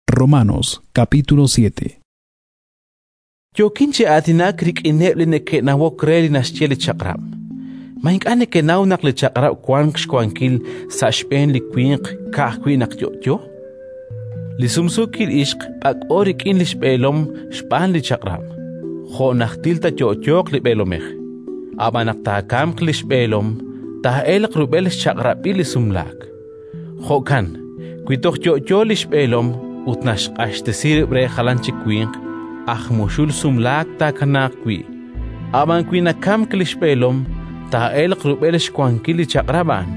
Ach'ab'anb'ilo chiru li Chaq'rab' Yookin chi aatinak rik'ineb' li neke'nawok re li naxye li chaq'rab'. Ma ink'a' nekenaw naq li chaq'rab' wank xwankil sa' xb'een li winq ka'ajwi' naq yo'yo? Li sumsuukil ixq b'ak'b'o rik'in li xb'eelom xb'aan li chaq'rab' jo' najtil taayo'yooq li b'eelomej; ab'an naq taakamq li xb'eelom, taa'elq rub'el xchaq'rab'il li sumlaak. Jo'kan wi toj yo'yo li xb'eelom ut naxq'axtesi rib' re jalan chik winq, aj muxul sumlaak taakanaaq wi'. Ab'an wi nakamk li xb'eelom, taa'elq rub'el xwankil li chaq'rab' a'an: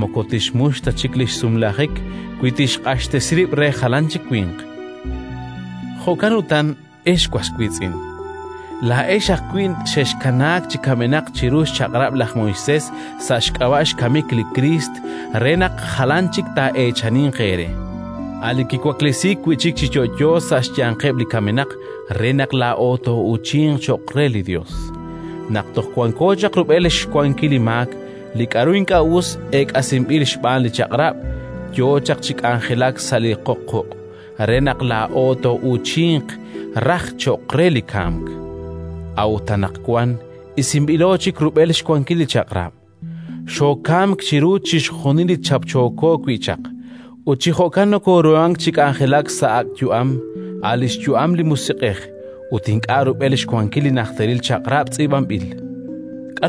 moko tixmux ta chik li xsumlajik wi tixq'axtesi rib' re jalan chik winq. Jo'kan utan, ex was wiitz'in, laa'ex ajwi' xexkanaak chi kamenaq chiru xChaq'rab' laj Moisés sa' xk'ab'a' xkamik li Kriist, re naq jalan chik taa'eechaninq eere: a' Li kiwaklesiik wi' chik chi yo'yo sa' xyanqeb' li kamenaq re naq laa'o too'uuchinq cho'q re li Yos. Naq toj wanko chaq rub'el xwankil li maak, li k'aru ink'a' us eek'asinb'il xb'aan li Chaq'rab' yo chaq chi k'anjelak sa' li qoq quq' re naq laa'o too'uuchinq raj cho'q re li kamk. A'ut anaqwan isinb'ilo chik rub'el xwankil li Chaq'rab': xookamk chiru chixjunil li chapchooko wi' chaq, ut chi jo'kan nokooruhank chi k'anjelak sa' ak' yu'am, a' li xyu'am li Musiq'ej, ut ink'a' rub'el xwankil li najteril chaq'rab' tz'iib'anb'il. Li xk'anjel li Chaq'rab'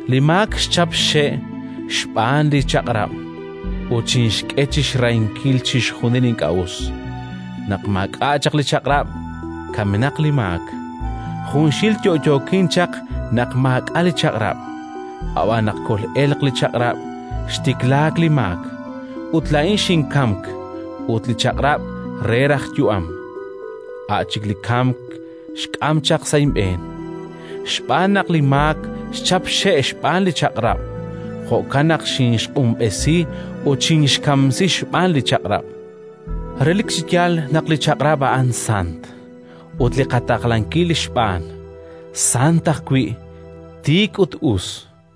Li maak xchap xxe' xb'aan li chaq'rab' ut xinxk'e chi xrahinkil chixjunil li ink'a' us. Naq maak'a' chaq li chaq'rab', kamenaq li maak. Junxil yo'yookin chaq naq maak'a' li chaq'rab'. Ab'an naq kol'elq li chaq'rab', xtiklaak li maak, ut laa'in xinkamk; ut li chaq'rab' re raj yu'am, a' chik li kamk xk'am chaq sa' inb'een. Xb'aan naq li maak xchap xxe' xb'aan li chaq'rab': jo'kan naq xinxq'unb'esi ut xkinxkamsi xb'aan li chaq'rab'. Relik chi yaal naq li Chaq'rab' a'an sant; ut li qataqlankil xb'aan, sant ajwi', tiik ut us.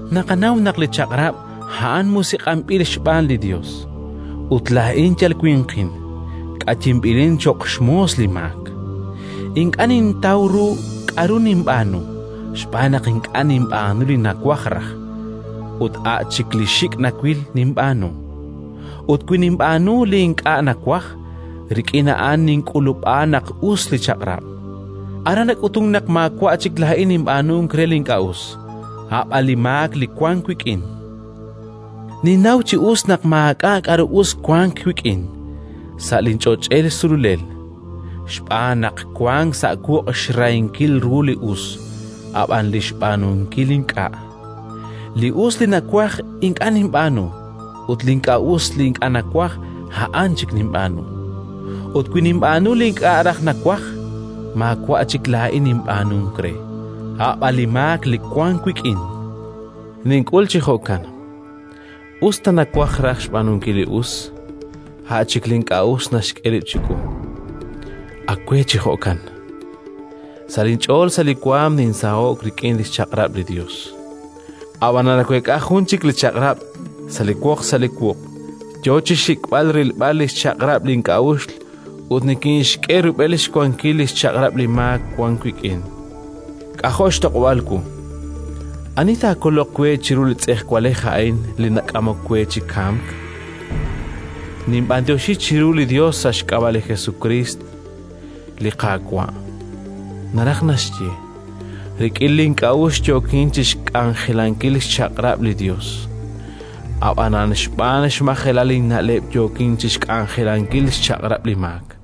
Naqanaw naq li Chaq'rab' a'an musiq'anb'il xb'aan li Yos, ut laa'in yal winqin, k'ayinb'ilin cho'q xmoos li maak. Ink'a' nintaw ru k'aru ninb'aanu, xb'aan naq ink'a' ninb'aanu li nawaj raj, ut a' chik li xik' nawil ninb'aanu. Ut wi ninb'aanu li ink'a' nawaj, rik'in a'an nink'ulub'a naq us li Chaq'rab'. Aran nak'utunk naq maawa' chik laa'in ninb'aanunk re li ink'a' us, a' b'an li maak li wank wik'in. Ninnaw chi us naq maak'a' k'aru us wank wik'in, sa' linch'och'el sululel. Xb'aan naq wank sa' wuq' xrahinkil ru li us, ab'an li xb'aanunkil ink'a': li us li nawaj ink'a' ninb'aanu, ut li ink'a' us li ink'a' nawaj, a'an chik ninb'aanu. Ut wi ninb'aanu li ink'a' raj nawaj, maawa' chik laa'in ninb'aanunk re, a' b'an li maak li wank wik'in. Nink'ul chi jo'kan: us ta nawaj raj xb'aanunkil li us, a' chik li ink'a' us naxk'e rib' chiwu. Ak we chi jo'kan. Sa' linch'ool sa' li waanm ninsaho'k rik'in xchaq'rab' li Yos, ab'anan naweek'a jun chik li chaq'rab' sa' li woq sa' li wuq' yo chi xxik'b'al rilb'al li xchaq'rab' link'a'uxl ut nikinxk'e rub'el xwankil li xchaq'rab' li maak wank wik'in. K'ajo' xtoq'ob'aal wu! Ani taakoloq we chiru li tz'ejwalej a'in li nak'amok we chi kamk? Ninb'anyoxi chiru li Yos sa' xk'ab'a' li Jesukriist, li Qaawa'. Naraj naxye, rik'in link'a'uxl yookin chi xk'anjelankil xchaq'rab' li Yos, ab'anan xb'aan xmajelal inna'leb' yookin chi xk'anjelankil xchaq'rab' li maak.